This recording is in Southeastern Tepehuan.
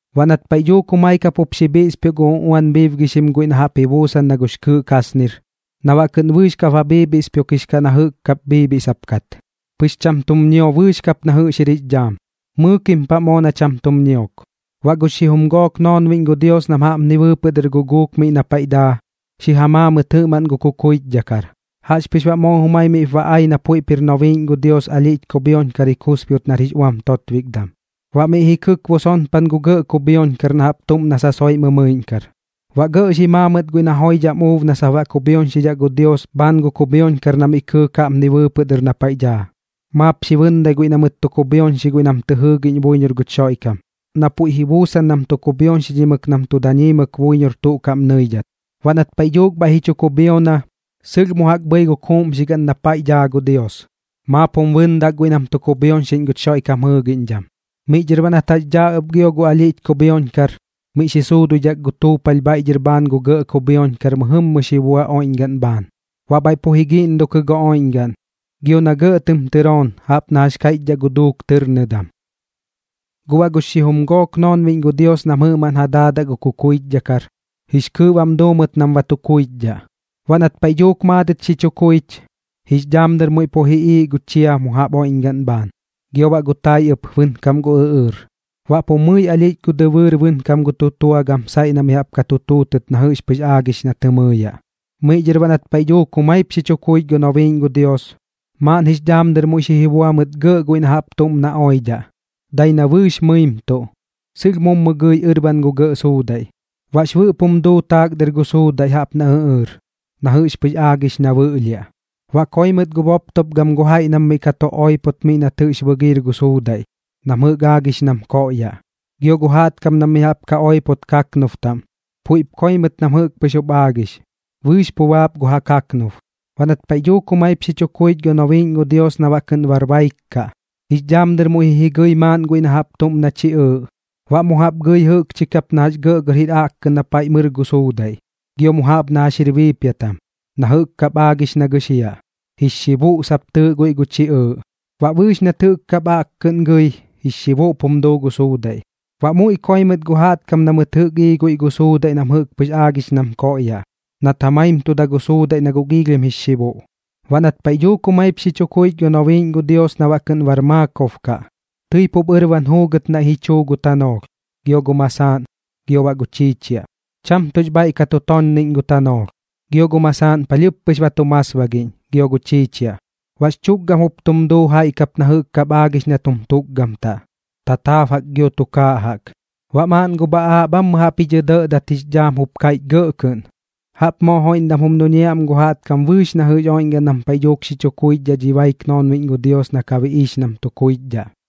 Baꞌ nat paiꞌ dhuuk jumai kap jup xi bhiꞌspioꞌ gu uꞌuan bhiibgixim guiꞌ na jaꞌp ji buusan na gux kɨɨꞌ kasnir na baꞌ kɨꞌn bɨɨx ba bhiibhiꞌspioꞌkix kaꞌ na jɨꞌk kap bhiibhiꞌsap kat, pɨx cham tum ñio bɨɨx kap na jɨꞌx jir jix dhaam, mɨɨkim paꞌ moo na cham tum ñiok. Baꞌ gux xijum gook gu noonbiꞌñ gu Dios nam jaꞌpni bɨɨpɨꞌ dɨr guguuk miꞌ na paiꞌ daa, xi ja maa mɨt jɨꞌmaꞌn gu kukuichdhakar. Jaꞌxpɨx baꞌ moo jumai miꞌp ba ai na puiꞌp jir nobiiꞌñ gu Dios alhiꞌch kubhioñkar ji kusbiot nar jix uam totbikdam, baꞌ miꞌ ji kɨkbo sonpan gu gɇꞌ kubhioñkar na jaꞌp tuꞌm na sasoiꞌ mɨmɨiꞌñkar. Baꞌ gɇꞌ xi maa mɨt guiꞌ na joidham uub na sap baꞌ kubhioñxidhaꞌ gu Dios bhaan gu kubhioñkar na miꞌ kɨɨk jaꞌpni bɨɨpɨꞌ dɨr na paiꞌ daa, maap xi bɨndai guiꞌ na mɨt tu kubhioñxi guiꞌ nam tɨ jɨɨgiꞌñ buiñor guch Xoiꞌkam, na puiꞌ ji buusan nam tu kubhioñxidhimɨk nam tu dañiimɨk buiñor tuꞌ kaꞌm nɨidhat. Baꞌ nat paiꞌ dhuuk bhaiꞌ ji chu kubhiona, sɨlh mu jaꞌk bhɨi gu kuuꞌmxigaꞌn na paiꞌ daa gu Dios, maap jum bɨndak guiꞌ nam tu kubhioñxiꞌñ guch Xoiꞌkam jɨɨgiꞌñdham. Miꞌ dhɨr baꞌ nat jax daa ɨp gio gu alhiꞌch kubhioñkar, miꞌ xi suuduidhak gu tuupalh bhaiꞌ dhɨr bhaan gu gɇꞌ kubhioñkar mɨjɨmmɨ xi bua oiꞌñgaꞌn bhaan. Baꞌ bhaiꞌ pu ji giꞌndokɨ gu oiꞌñgaꞌn, gio na gɇꞌ tɨm tɨroon jaꞌp na jax kaiꞌchidhaꞌ gu duuk tɨrnɨdam. Guꞌ baꞌ gux xijum gook noonbiꞌñ gu Dios nam jɨꞌmaꞌn ja daadaꞌ gu kukuichdhakar, jix kɨɨꞌ bam duu mɨt nam ba tu kuichdhaꞌ. Baꞌ nat paiꞌ dhuuk maadɨt xi chu kuich, jix dhaam dɨr muiꞌ pu ji iiꞌ gu chia mu jaꞌp oiꞌñgaꞌn bhaan, gio baꞌ gu tai ɨp bɨnkam gu ɨꞌɨɨr. Baꞌ pu mɨi alhiꞌch gu dɨbɨɨr bɨnkam gu tutua gam saiꞌ na mi jaꞌp ka tu tuutɨt na jɨꞌx pɨx aagix na tɨ mɨɨyaꞌ. Miꞌ dhɨr baꞌ nat paiꞌ dhuuk jumaip xi chu kuich gu nobiiꞌñ gu Dios, maaꞌn jix dhaam dɨr muiꞌ xi jibua mɨt gɇꞌ guiꞌ na jaꞌp tuꞌm na oidhaꞌ, dai na bɨɨx mɨimtuꞌ, sɨlh mummu gɨi ɨrban gu gɇꞌ suudaiꞌ. Baꞌx bɨꞌp jum duu taak dɨr gu suudaiꞌ jaꞌp na ɨꞌɨɨr na jɨꞌx pɨx aagix na bɨꞌlhiaꞌ. Baꞌ koi mɨt gu boptop gam gu jaiꞌ nam miꞌ ka tu oipot miꞌ nat jɨꞌx bɨgiir gu suudaiꞌ na jɨꞌk aagix nam koꞌyaꞌ. Gio gu jaꞌtkam nam mi jaꞌp ka oipot kaknub taꞌm puiꞌp koi mɨt nam jɨꞌk pɨx jup aagix, bɨɨx pu baap gu ja kaknub. Baꞌ nat paiꞌ dhuuk jumaip xi chu kuich gu nobiiꞌñ gu Dios na baꞌ kɨꞌn bar baik kaꞌ, jix dhaam dɨr muiꞌ ji jigɨi maaꞌn guiꞌ na jaꞌp tuꞌm na chiꞌɨɨꞌ, baꞌ mu jaꞌp gɨi jɨꞌkchi kap gɇꞌgɇr jir aꞌkkɨꞌn na paiꞌ mɨr gu suudaiꞌ gio mu jaꞌp na jax jir biipiatam, na jɨꞌk kap aagix na gɨxiaꞌ. Jix Xibuꞌ sap tɨɨꞌ guiꞌ gu chiꞌɨɨꞌ, baꞌ bɨɨx nat jɨꞌk kap aꞌkkɨꞌn gɨi, jix xibuꞌp jum duu gu suudaiꞌ. Baꞌ muiꞌ koi mɨt gu jaꞌtkam na mɨt jɨꞌk ii guiꞌ gu suudaiꞌ na jɨꞌk pɨx aagix nam koꞌyaꞌ, nat ja maimtuda gu suudaiꞌ na guꞌ giilhim jix xibuꞌ. Baꞌ nat paiꞌ dhuuk jumaip xi chu kuich gu nobiiꞌñ gu Dios na baꞌ kɨꞌn bar maakob kaꞌ, tɨi pup ɨrban juugɨt naiꞌ ji chuu gu tanoolh, gio gu masaaꞌn, gio baꞌ gu chiichiaꞌ. Cham tuꞌx bhaiꞌ ka tu tonniꞌñ gu tanoolh, gio gu masaaꞌn palhɨɨp pɨx ba tum masbagiꞌñ gio gu chiichiaꞌ, baꞌx chukgam jup tum duu jaiꞌ kap na jɨꞌk kap aagix na tum tukgamtaꞌ, tataab jaꞌk gio tukaaꞌ jaꞌk. Baꞌ maaꞌn gu bhaꞌaaꞌ bhammɨ jaꞌp ji dhɇdɇꞌdat jix dhaam jup kaiꞌch gɇꞌ kɨꞌn: ―Jaꞌp moo joiꞌndam jum duñiaꞌ am gu jaꞌtkam bɨɨx na jɨꞌx oiꞌñgaꞌn nam paiꞌ dhuuk xi chu kuichdhaꞌ dhi baik noonbiꞌñ gu Dios nam ka biꞌiix nam tu kuichdhaꞌ.